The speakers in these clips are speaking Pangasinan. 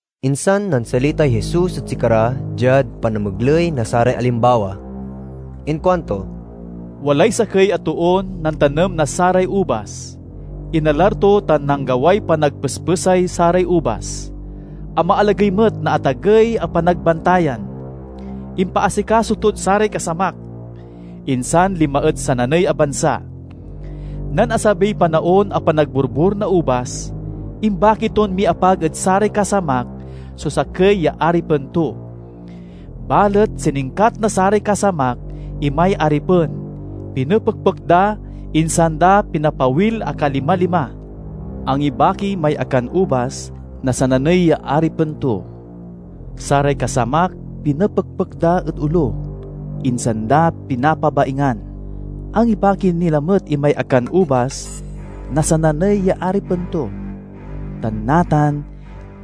Insan nansalitay Jesus ed sikara diad panamegley na saray alimbawa. Inkuanto, "Walay sakey a toon nantanem na saray ubas. Inalar to tan nanggaway panagpespesay saray ubas. Amalagey met na atagey a panagbantayan. Impaasikaso tod saray kasamak, insan linma ed sananey a bansa. Nen asabiy panaon a panagborbor na ubas, imbaki ton miapag ed saray kasamak so sakey ya aripen to. Balet siningkat na saray kasamak imay aripen, pinepekpek da, insan da pinapawil a kalima-lima. Angibaki may akanubas na sananey ya aripen to. Saray kasamak pinepekpek da ed olo, insan da pinapabaingan. Angibaki ni lamet imay akanubas na sananey ya aripen to, tan natan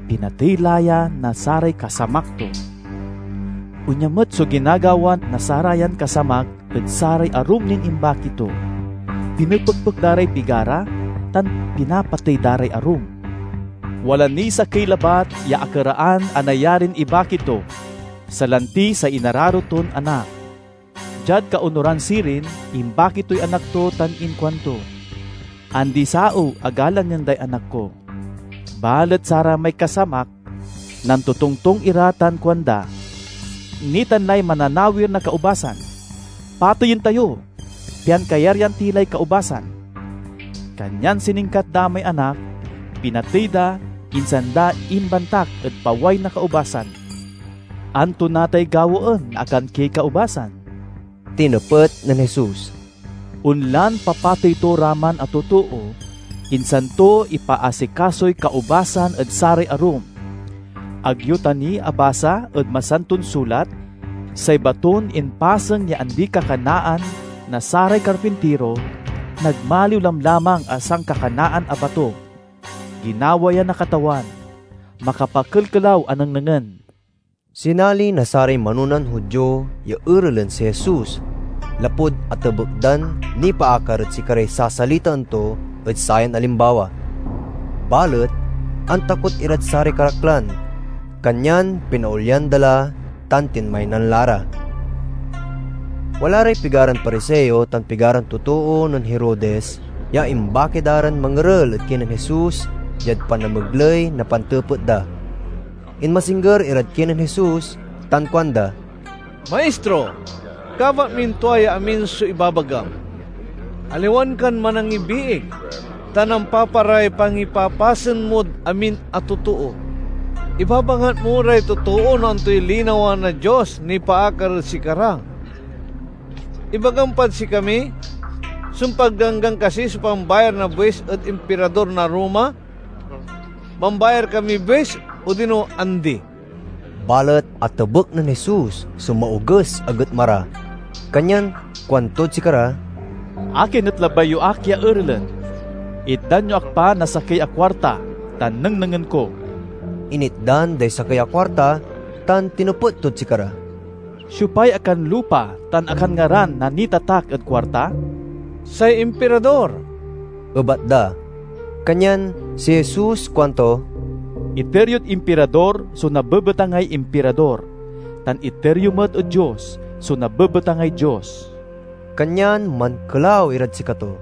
pinatey la ya na saray kasamak to. Onya met so ginagawa na sarayan kasamak ed saray arum nin imbaki to. Pinepekpek da ray pigara tan pinapatey da ray arum. Wala niy sakey labat ya akeraan a nayarin ibaki to, salanti say inararo ton anak. Diad kaonuran sirin imbaki toy anak to tan inkuanto, 'Andi-saew a galangen day anak ko.' Balet saramay kasamak nantotongtong ira tan kuanda, 'Nitan lay mananawir na kaubasan. Pateyen tayo, pian kayaryan ti lay kaubasan!' Kanyan siningkat da may anak, pinatey da, insan da imbantak ed paway na kaubasan. "Anto natay gawaen na akankiey kaubasan?" tinepet nen Jesus. "Onlan papatey to ra man a totoo, insan to ipaasikasoy kaubasan ed saray arum. Ag yo ta ni abasa ed Masanton Sulat? 'Say baton impasen ya andi-kakanaan na saray karpintiro nagmaliw lamlamang a sankakanaan a bato. Ginawa ya na Katawan; makapakelkelaw a nengnengen!'" Sinali na saray manonan Judio ya erelen si Jesus lapud atebek dan nipaakar ed sikaray sasalitaen to ed sayan alimbawa. Balet antakot irad saray karaklan, kanyan pinaolyan da la tan tinmaynan la ra. Wala ray pigaran Pariseo tan pigaran totoo nen Herodes ya imbaki da ran mangerel ed kinen Jesus diad panamegley na pantepet da. Inmasingger irad kinen Jesus tan kuanda, "Maistro, kabat min tua ya amin so ibabagam. Aliwan kan manangibiig, ta nampaparay pangipapasen mod amin a totoo. Ibabangat mo ray totoo no antoy linawa na Dios nipaakar ed sikara. Ibagam pad sikami, sumpad Ganggan kasi so pambayar na buis ed Impirador na Roma? Mambayar kamiy buis odino andi?" Balet atebek nen Jesus so maoges a getma ra, kanyan kuantod sikara, "Akin et labay yo ak ya erelen? Itdan yo ak pa na sakey a kuarta ta nengnengen ko." Initdan day sakey a kuarta, tan tinepet tod sikara, "Siopay akanlupa tan akanngaran na nitatak ed kuarta?" "Say Impirador," ebat da. Kanyan si Jesus kuanto, "Iter yod Impirador so nabebetangay Impirador, tan iter yo met ed Dios so nabebetangay Dios." Kanyan mankelaw irad sikato.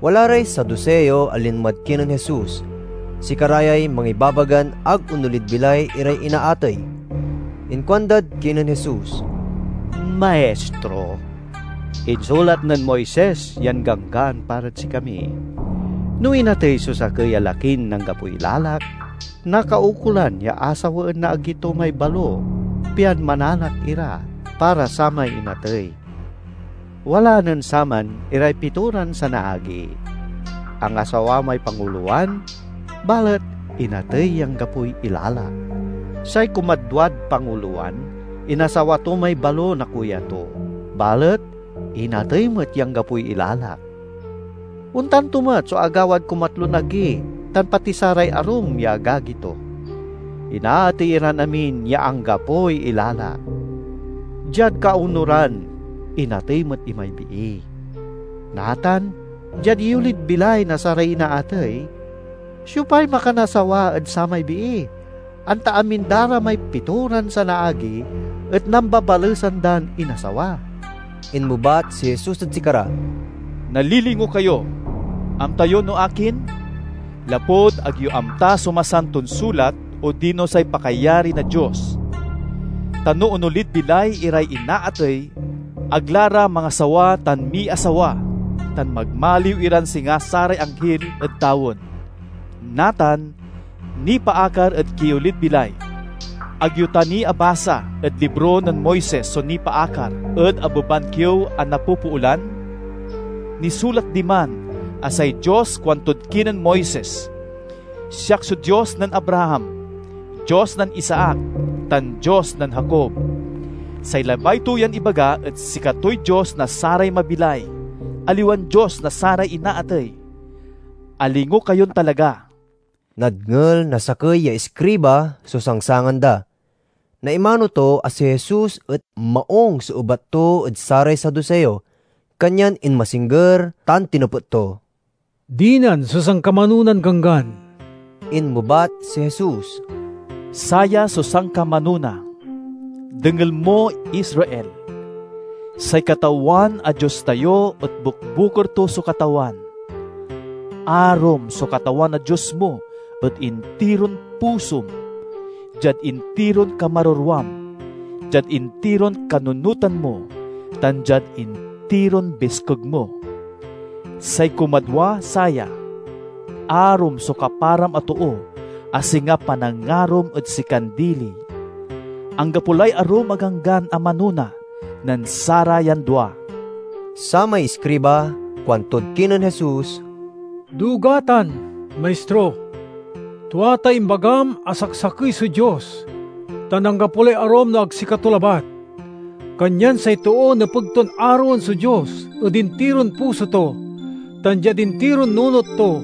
Wala ray Saduseo a linmad kinen Jesus. (Sikara yay mangibabagan ag onolid bilay iray inaatey.) Inkuandad kinen Jesus. "Maistro, insulat nen Moises yan ganggan para sikami: 'No inatey so sakey a lakin anggapoy ilalak, nakaukolan ya asawaen na agi to may balo pian mananak ira para samay inatey.' Wala nen saman iray pitoran sanaagi. Angasawa may pangulowan, balet inatey ya anggapoy ilalak. Say kumadwad pangulowan inasawa to may balo na kuya to, balet inatey met ya anggapoy ilalak. Ontan to met so agawad kumatlon agi tan pati saray arum ya agagi to. Inaatey iran amin ya anggapoy ilalak. Diad kaonuran, inatey met imay bii. Natan, diad iyolid bilay na saray inaatey, siopay makanasawa ed samay bii, anta amin da ra may pitoran sanaagi et nambabalesan dan inasawa?" Inmebat si Jesus ed sikara, "Nalilingo kayo! Amta yo no akin? Lapud ag yo amta so Masanton Sulat odino say pakayari na Dios. Ta no onolid bilay iray inaatey, ag la ra mangasawa tan miasawa, tan magmaliw iran singa saray anghil ed tawen. Natan, nipaakar ed kiolid bilay: ag yo ta ni abasa ed libro nen Moises so nipaakar ed abeban kiew a napopoolan? Nisulat diman a say Dios kauntod kinen Moises, 'Siak so Dios nen Abraham, Dios nen Isaac, tan Dios nen Jacob.' Say labay to yan ibaga et sikatoy Dios na saray mabilay, aliwan Dios na saray inaatey. Alingo kayon talaga!" Nadngel na sakey ya iskriba so sangsangan da. Naimano to a si Jesus et maung so ebat to ed saray Saduseo, kanyan inmasingger tan tinepet to, "Dinan so sankamanonan ganggan?" Inmebat si Jesus, "Saya so sankamanona: 'Dengel mo, Israel! Say Katawan a Dios tayo et bukbukor to so Katawan. Arom so Katawan a Dios mo ed intiron pusom, diad intiron kamarerwam, diad intiron kanunotan mo, tan diad intiron biskeg mo.' Say kumadwa saya: 'Arom so kaparam a too a singa panangarom ed sikan dili.' Anggapo lay arum a ganggan a manona nen sarayan dua." Samay iskriba kuantod kinen Jesus, "Duga tan, Maistro! Tua tay imbagam a saksakey so Dios, tan anggapo lay arum no ag sikato labat. Kanyan say too nepeg ton aroen so Dios ed intiron puso to, tan diad intiron nunot to,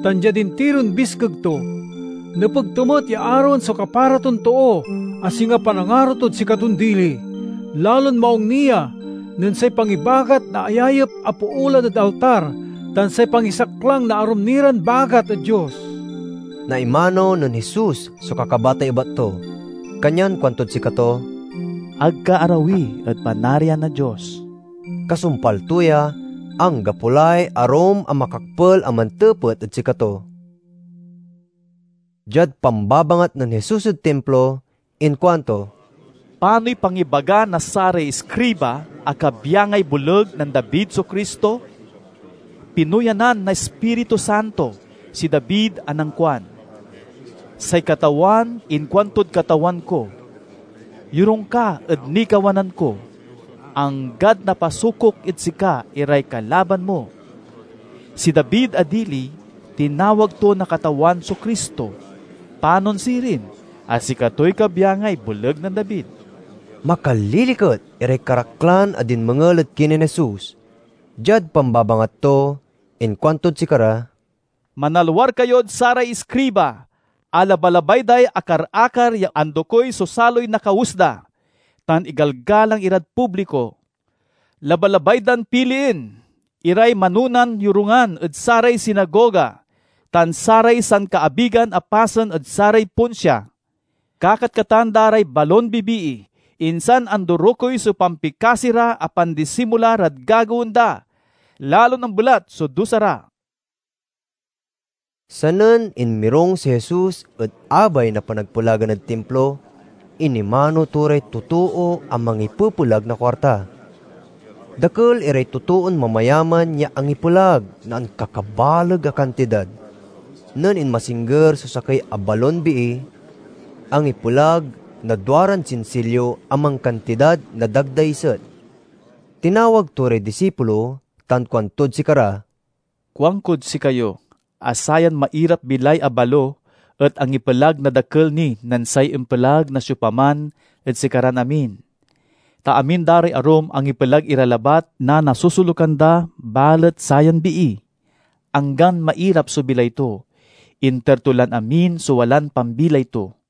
tan diad intiron biskeg to. Nepeg to met ya aroen so kapara ton too a singa panangaro tod sikaton dili. Lalon maung ni ya, nen say pangibagat na ayayep a poolan ed altar tan say pangisaklang na arum ni ran bagat ed Dios." Naimano nen Jesus so kakabatay ebat to, kanyan kuantod sikato, "Ag ka arawi ed Panarian na Dios." Kasumpal to ya, anggapo lay arum a makakpel a mantepet ed sikato. Diad pambabangat nen Jesus ed Timplo, inkuanto, "Panoy pangibaga na saray iskriba a kabyangay boleg nen David so Cristo? Pinuyanan na Ispiritu Santo si David a nankuan: 'Say Katawan inkuantod Katawan ko: Yorung ka ed nikawanan ko, anggad napasukok ed sika iray kalaban mo.' Si David a dili tinawag to na Katawan so Cristo; panon sirin a sikatoy kabyangay boleg nen David?" Makaliliket iray karaklan a dinmengel ed kinen Jesus. Diad pambabangat to, inkuantod sikara, "Manalwar kayod saray iskriba a labalabay day akar-akar ya andokey so saloy na kawes da, tan igalgalang irad publiko. Labalabay dan pilien iray manonan yorungan ed saray sinagoga tan saray sankaabigan a pasen ed saray ponsia. Kakatkatan da ray balon bibii, insan andorokey so pampikasi ra a pandisimula rad gagawaen da. Lalon ambelat so dusa ra!" Sanen inmirung si Jesus ed abay na panagpelagan ed Timplo, inimano to ray totoo a mangipepelag na kuarta. Dakel iray totoon mamayaman ya angipelag na ankakabaleg a kantidad. Nen inmasingger so sakey a balon bii, angipelag na duaran sinsilyo a mankantidad na dagdaiset. Tinawag to ray disipulo, tan kuantod sikara, "Kuankod sikayo a sayan mairap-bilay a balo et angipelag na dakel ni nen say impelag na siopaman ed sikaran amin. Ta amin da ray arum angipelag ira labat na nasosolukan da balet sayan bii, anggan mairap so bilay to, inter to lan amin so walan pambilay to."